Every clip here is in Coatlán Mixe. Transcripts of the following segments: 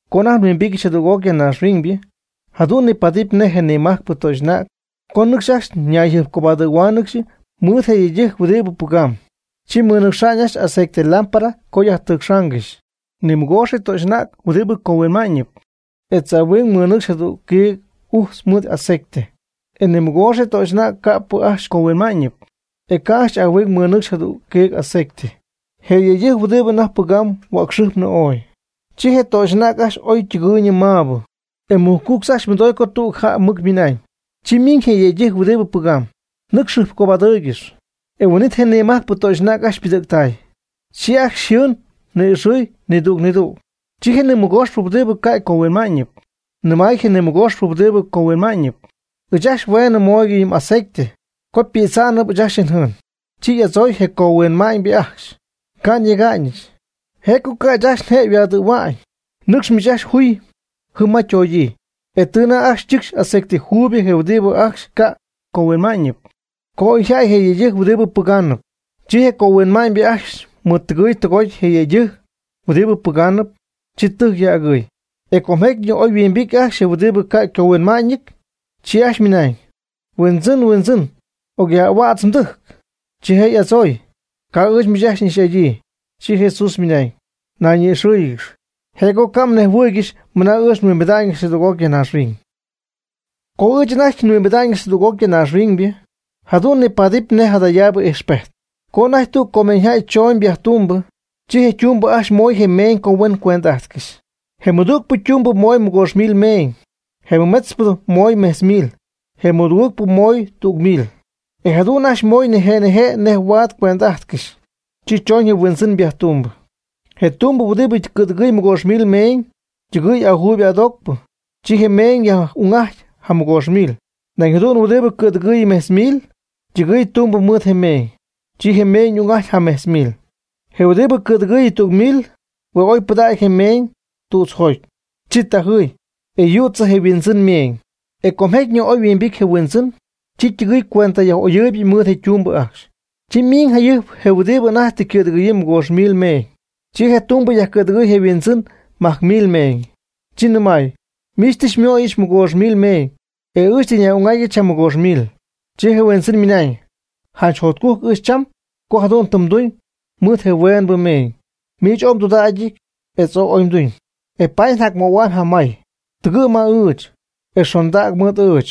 Co anajty nhuimbityɨch jadüg'oc ya naaxhuiñybɨ jadu'n nipaadɨp nej je nimajcpɨ töxy'anäg co ñɨcxy ajcxy ñayjɨjpcobadɨ̈huáanɨgɨxy mɨɨd je yëydɨjc huɨdi pɨgamb. Chi mɨnɨcxy ajcxy aceite lámpara co yajtɨcxaangɨxy. Nimɨgoox je töxy'anäg huɨdi cohuinma'ñɨty etz ahuing mɨnɨcxy jadüg quiig ujtz mɨɨd aceite. E nimɨgoox je töxy'anäg ca'pɨ ajcxy cohuinma'ñɨty, e ca' ajcxy ahuing mɨnɨcxy jadüg quiig aceite. E je yëydɨjc huɨdibɨ anajty pɨgamb huäcxɨjpnɨ ooy, chi je töxy'anäg ajcxy ooy ytɨgɨɨyñɨ mä'uuybɨ. E mɨjcuctz ajcxy mɨdoy co tüg jäy mɨc mɨna'ñ: “Chi miiñ je yëydɨjc huɨdibɨ pɨgamb, nɨcx jɨjpcobadɨɨygɨxy.” E huin'it je nimajcpɨ töxy'anäg ajcxy ypɨdɨ̈ctay. Chi ajcxy yjɨɨn ni'ixɨɨy nidüg nidüg. Chi je nimɨgooxpɨ huɨdibɨ ca' ycohuinma'ñɨty nɨmay je nimɨgooxpɨ huɨdibɨ cohuinma'ñɨp: “Ɨɨch ajcxy hueenɨ mooygɨch yɨ m'aceite, co pïdzaanɨp ɨɨch ajcxy njɨɨn.” Chi y'adzooy je cohuinma'ñybɨ ajcxy: “Ca' nyega'ñɨch, je' co ca' ɨɨch ajcxy nje' yhuaadɨ̈hua'ñ. Nɨcx miich ajcxy juy jɨm ma ytoogyii.” E tɨ anajty ajcxy ñɨcxy aceite juuyb je huɨdibɨ ajcxy ca' ycohuinma'ñɨty, co oy yjäty je yëydɨjc huɨdibɨ pɨgaanɨp. Chi je cohuinma'ñybɨ ajcxy mɨɨd tɨgɨy tɨgoty je yëydɨjc huɨdibɨ pɨgaanɨp. Chi tɨjc yaj'agɨɨy. E com jecyñɨ oy yhuimbity ajcxy je huɨdibɨ ca' ycohuinma'ñɨty. Chi ajcxy ymɨnañ: “¡Huindzɨn, Huindzɨn, ocyaj'ahuädz mdɨjc!” Chi je' y'adzooy: “Ca' ɨɨch miich ajcxy n'ixy'adyii.” Chi Jesús ymɨnañ: ―Nayñi'ixɨ́ɨyɨgɨx, je' co ca' mnejhuɨɨygɨxy mɨna ɨɨch nhuimbida'ñɨch jadüg'oc ya naaxhuiñ. Co ɨɨch anajty nhuimbida'ñɨch jadüg'oc ya naaxhuiñybɨ, jadu'n nipaadɨp nej jadayaabɨ ijxpejt, co anajty tüg comeeñyjäy chona'ñ viajetumbɨ, chi je' ytumbɨ ajcxy mooy je meeñ co huen cuend'ajtcɨxy. Je ymɨdügpɨ tumbɨ moy mɨgoox mil meeñ. Je mɨmetzpɨ moy mejtz mil. E je ymɨdugɨɨgpɨ moy tüg mil. E jadu'n ajcxy moy nije' nije' nej huaad cuend'ajtcɨxy. Chi choñ je huindzɨn viajetumbɨ. Je tumbɨ huɨdibɨ cɨ̈dɨgɨɨyɨ mɨgoox mil meeñ, ytɨgɨy ajuybɨ adoocpɨ. Chi je' ymeeñ y'ung'ajty jamɨgoox mil. Nañ jadu'n huɨdibɨ cɨ̈dɨgɨɨy mejtz mil, ytɨgɨɨy tumbɨ mɨɨd je meeñ. Chi je' ymeeñ y'ung'ajty ja mejtz mil. Je huɨdibɨ cɨ̈dɨgɨɨy tüg mil hue' oy pɨdägy je meeñ tützjoty. Chi tajɨy, e yützɨ je yhuindzɨn ymeeñ. E com jecyñɨ oy yhuimbity je huindzɨn. Chi ytɨgɨɨy cuenta yaj'oyɨɨyb mɨɨd je ytumbɨ ajcxy. Chi miiñ jayɨjp je huɨdibɨ anajty tɨ cɨ̈dɨgɨ̈yii mɨgoox mil meeñ. Chi je tumbɨ yajcɨ̈dɨgɨɨy je' yhuindzɨn majc mil meeñ. Chi ymɨnañ: “Miich tɨ xymooyɨch mɨgoox mil meeñ, e ɨɨch tɨ nyaj'ung'atyɨch jamɨgoox mil.” Chi je' yhuindzɨn mɨnaañ: “Janch jotcujc ɨɨch cham co jadu'n tɨ mduñ mɨɨd je hueenbɨ meeñ. Miich ooy mdudägy etz oy tɨ mduñ, e paady njacmöhuamyb jacmay. Tɨgɨ' ma ɨɨch, e xondäg mɨɨd ɨɨch.”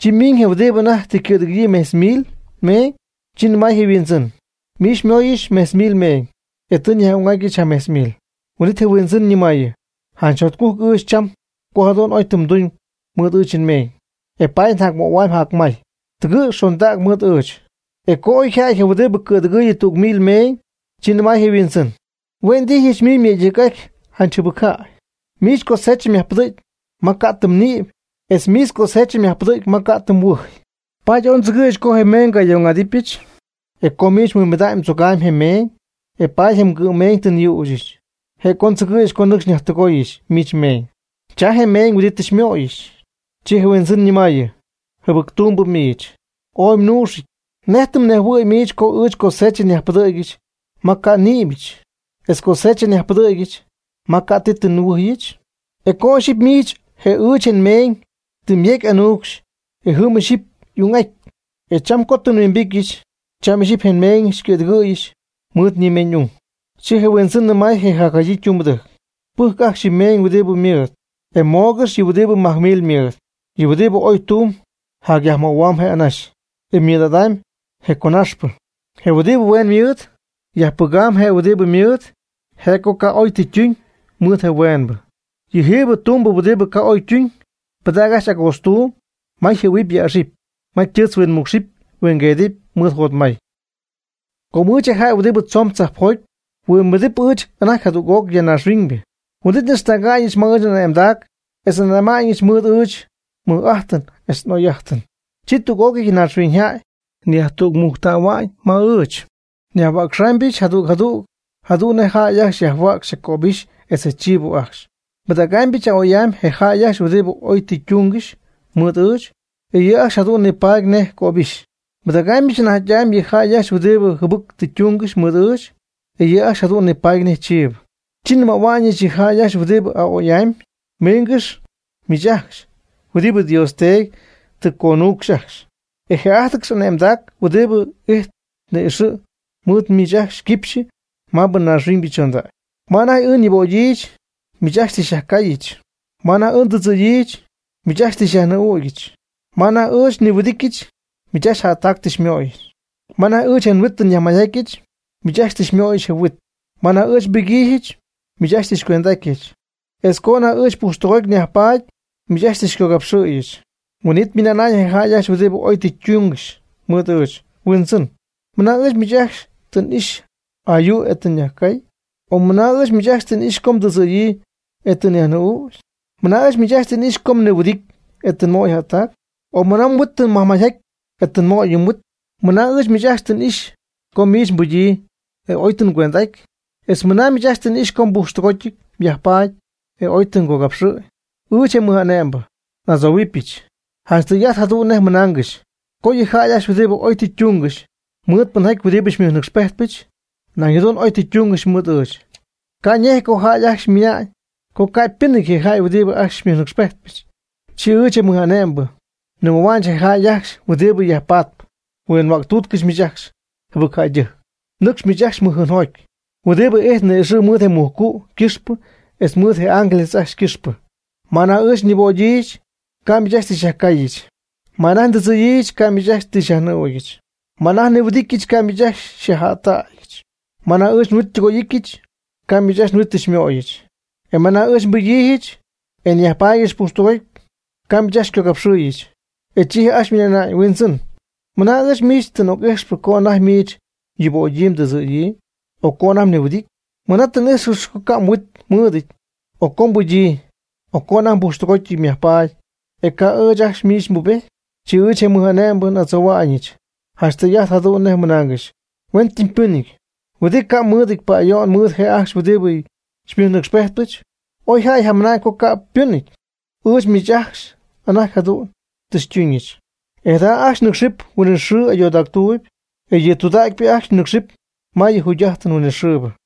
Chi ymiñ je huɨdibɨ anajty tɨ cɨ̈dɨgɨ̈yii mejtz mil meeñ. Chi nɨmay je yhuindzɨn: “Miich xymooyɨch mejtz mil meeñ, e tɨ nyaj'ung'atyɨch jamejtz mil.” Huin'it je' yhuindzɨn ñɨmaayɨ: “Janch jotcujc ɨɨch cham, co jadu'n oy tɨ mduñ mɨɨd ɨɨch nmeeñ, e paady njacmöhuamy jacmay. Tɨgɨ' xondäg mɨɨd ɨɨch.” E co oy yja'ty je huɨdibɨ cɨ̈dɨgɨɨyb tüg mil meeñ, chi nɨmay je' yhuindzɨn: “Huindzɨn, hue' ndijyɨch miich myëydɨjc'aty janch jɨbɨc jäy. Miich cosecha myajpɨdɨ̈cpy ma ca' tɨ mnïpy etz miich mgosecha myajpɨdɨ̈cpy ma ca' ti tɨ mhuɨjy. Paady ooy ndzɨgɨ̈yɨch co je meeñ ngayaj'ung'adɨpyɨch. E co miich mhuimbida'ñ, mdzogamy je mmeeñ, e paady je mgɨ'mmeeñ tɨ nyüchɨch, je' co ndzɨgɨ̈yɨch co nɨcxy nyajtɨgooyɨch miich mmeeñ. Cha je meeñ huɨdibɨ tɨ xymooyɨch.” Chi je' yhuindzɨn ñɨmaayɨ: “Jɨbɨc tumbɨ miich, ooy mnuuxɨty. ¿Nej tɨ mnejhuɨ̈y miich co ɨɨch cosecha nyajpɨdɨ̈gyɨch ma ca' ti tɨ nnïbyɨch, etz cosecha nyajpɨdɨ̈gyɨch ma ca' ti tɨ nhuɨjyɨch? Oy co ixyipy miich je ɨɨch nmeeñ tɨ myejc'anuucxy, e jɨm ixɨpy y'ung'at. E cham co tɨ nhuimbityɨch cham ixyipy je nmeeñɨch xycɨ̈dɨgɨ̈yɨch mɨɨd nimeeñ'ung.” Chi je huindzɨn nɨmay je jacjadyii tumbɨdɨjc: “Pɨjcɨ ajcxy yɨ meeñ huɨdi ymɨɨd, e mooygɨx yɨ huɨdibɨ majc mil ymɨɨd. Je huɨdibɨ oy tumb jacyajmöhuamb je' anaxy, e ymɨɨd'adamy je' conaxpɨ. Je' huɨdibɨ hueen mɨɨd yajpɨgamb je' huɨdi ymɨɨd, je' co ca' oy tɨ ytuñ mɨɨd je hueenbɨ. Yɨ jiibɨ tumbɨ huɨdibɨ ca' oy ytuñ, pɨdäg ajcxy agootztuuby ma yjɨ̈huɨpy yäxɨpy, ma ytɨɨtz huinmuucx huingueedɨp mɨɨd jotmay.” Co ɨɨch, je jäy huɨdibɨ tzoon tzajpjoty, nhuimbity ɨɨch anajty jadüg'oc ya naaxhuiñybɨ, huin'it n'ixtäga'ñɨch ma ɨɨch n'ane'mdac etz ane'ma'ñɨch mɨɨd ɨɨch nmɨj'ájtɨn etz n'oy'ajtɨn. Chi tüg'ócɨy je naaxhuiñyjäy yajtügmujctähua'ñ ma ɨɨch. Nhuäcxamybɨch jadüg jadüg jadu'n nej jäy ajcxy huäcxy je cöbixy etz je chiibo ajcxy. Nbɨdägaamybɨch a'oy'amy je jäy ajcxy huɨdibɨ oy tɨ ytungɨxy mɨɨd ɨɨch. E yɨ' ajcxy jadu'n nipaadɨp nej cöbɨxy. Nbɨdägaamybɨch anajty'amy yɨ jäy ajcxy huɨdibɨ jɨbɨc tɨ ytungɨxy mɨɨd ɨɨch. E yɨ' ajcxy jadu'n nipaadɨp nej chiibɨ. Chi nnɨmähuɨbɨch yɨ jäy ajcxy huɨdibɨ a'oy'amy: “Miingɨx miich ajcxy huɨdibɨ Dios Teedy tɨ xyconuucxy ajcxy. Je'ájtɨgɨx ane'mdac huɨdibɨ ijtp ni'ixɨ̈ mɨɨd miich ajcxy ycɨxpɨ maabɨ naaxhuiñybɨ chondägy. Ma anajty ɨɨch nyuubögyii miich ajcxy tɨ xyajcaayɨch; ma anajty ɨɨch ndɨdzɨ̈yii, miich ajcxy tɨ xyajnɨɨ'ügyɨch; ma anajty ɨɨch nihuɨdɨtyɨch, miich ajcxy jättac tɨ xymöyɨch; ma anajty ɨɨch je nhuit tɨ nyajmayjatyɨch, miich ajcxy tɨ xymöyɨch je huit; ma anajty ɨɨch nbɨgyiijɨch, miich ajcxy tɨ xycuend'átyɨch; etz co anajty ɨɨch pujxtɨgoty nyajpaady, miich ajcxy tɨ xycogapxɨ̈yɨch.” Huin'it ymɨna'na'ñ je jäy ajcxy huɨdibɨ oy tɨ ytungɨxy mɨɨd ɨɨch: “Huindzɨn, ¿mɨna ɨɨch miich ajcxy tɨ n'ixy ayuu, e tɨ nyajcay? O ¿mɨna ɨɨch miich ajcxy tɨ n'ixy co mdɨdzɨ̈yii, e tɨ nyajnɨɨ'ügy? ¿Mɨna ɨɨch miich ajcxy tɨ n'ixy co miich mnihuɨdity, e tɨ nmöy jättac? O ¿mɨna mhuit tɨ myajmayjaty, e tɨ nmöy je mhuit? ¿Mɨna ɨɨch miich ajcxy tɨ n'ixy, co miich mbɨgyii, e oy tɨ ngüend'aty? etz ¿mɨna ɨɨch miich ajcxy tɨ n'ixy co pujxtɨgoty myajpaady, e oy tɨ ngogapxɨ̈y?” Ɨɨch, je mɨj'ane'mbɨ, n'adzohuimbɨdɨpyɨch: “Janch tɨy'ajt jadu'n nej nnɨmaaygɨxy co yɨ jäy ajcxy huɨdibɨ oy tɨ ytungɨxy mɨɨd pɨnjaty huɨdibɨ xymɨjnɨcxpejtpɨch, nañ jadu'n oy tɨ ytungɨxy mɨɨd ɨɨch. Ca' ñéjɨty co jäy ajcxy ymɨnañ co ca' ypɨnɨty je jäy huɨdibɨ xymɨjnɨcxpejtpɨch.” Chi ɨɨch, je mɨj'ane'mbɨ, nɨmähuɨbɨch je jäy ajcxy huɨdibɨ yajpatp: “Huinhuäctuutcɨch miich ajcxy jɨbɨcjäydɨjc. Nɨcxy miich ajcxy mɨjjɨɨnjoty, huɨdibɨ ijtp ni'ixɨ̈ mɨɨd je mujcu' ycɨxpɨ etz mɨɨd je' y'ángeles ajcxy ycɨxpɨ. Ma anajty ɨɨch nyuubögyii, ca' miich ajcxy xyajcaayɨch; ma anajty ɨɨch ndɨdzɨ̈yii, ca' miich ajcxy xyajnɨɨ'ucyɨch; ma anajty nnihuɨdityɨch, ca' miich ajcxy xyajjättägyɨch; ma anajty ɨɨch nhuit xytɨgoy'íjtɨgɨch, ca' miich ajcxy huit xymooyɨch; etz ma anajty ɨɨch nbɨgyii e nyajpaadyɨch pujxtɨgoty, ca' miich ajcxy xycogapxɨɨyɨch.” E chi je' ajcxy ymɨna'na'ñ: “Huindzɨn, ¿mɨna ɨɨch ajcxy miich tɨ n'ijxcɨxy co anajty miich yubögyii tɨdzɨ̈yii, o co anajty mnihuɨdity? ¿Mɨna tɨ n'ijxcɨxy co ca' mhuit mɨɨdɨty, o co mbɨgyii, o co anajty pujxtɨgoty myajpaady, e ca' ɨɨch ajcxy miich nbubejty?” Chi ɨɨch, je mɨj'ane'mbɨ, n'adzohua'ñɨch: “Janch tɨy'ajt jadu'n nej nnɨmaaygɨxy. Huen tɨm pɨnɨty huɨdibɨ ca' mɨɨdɨty pa'ayo'n mɨɨd je' ajcxy huɨdibɨ xymɨjnɨcxypejtpɨch, oy jäy yjamɨna'ñ co ca' ypɨnɨty, ɨɨch miich ajcxy anajty jadu'n tɨ xytuñɨch.” E jada ajcxy nɨcxɨp huinɨxɨɨ ayoodactuuby, e yɨ tudägypɨ ajcxy nɨcxɨp ma yɨ jugy'ajtɨn huinɨxɨɨbɨ.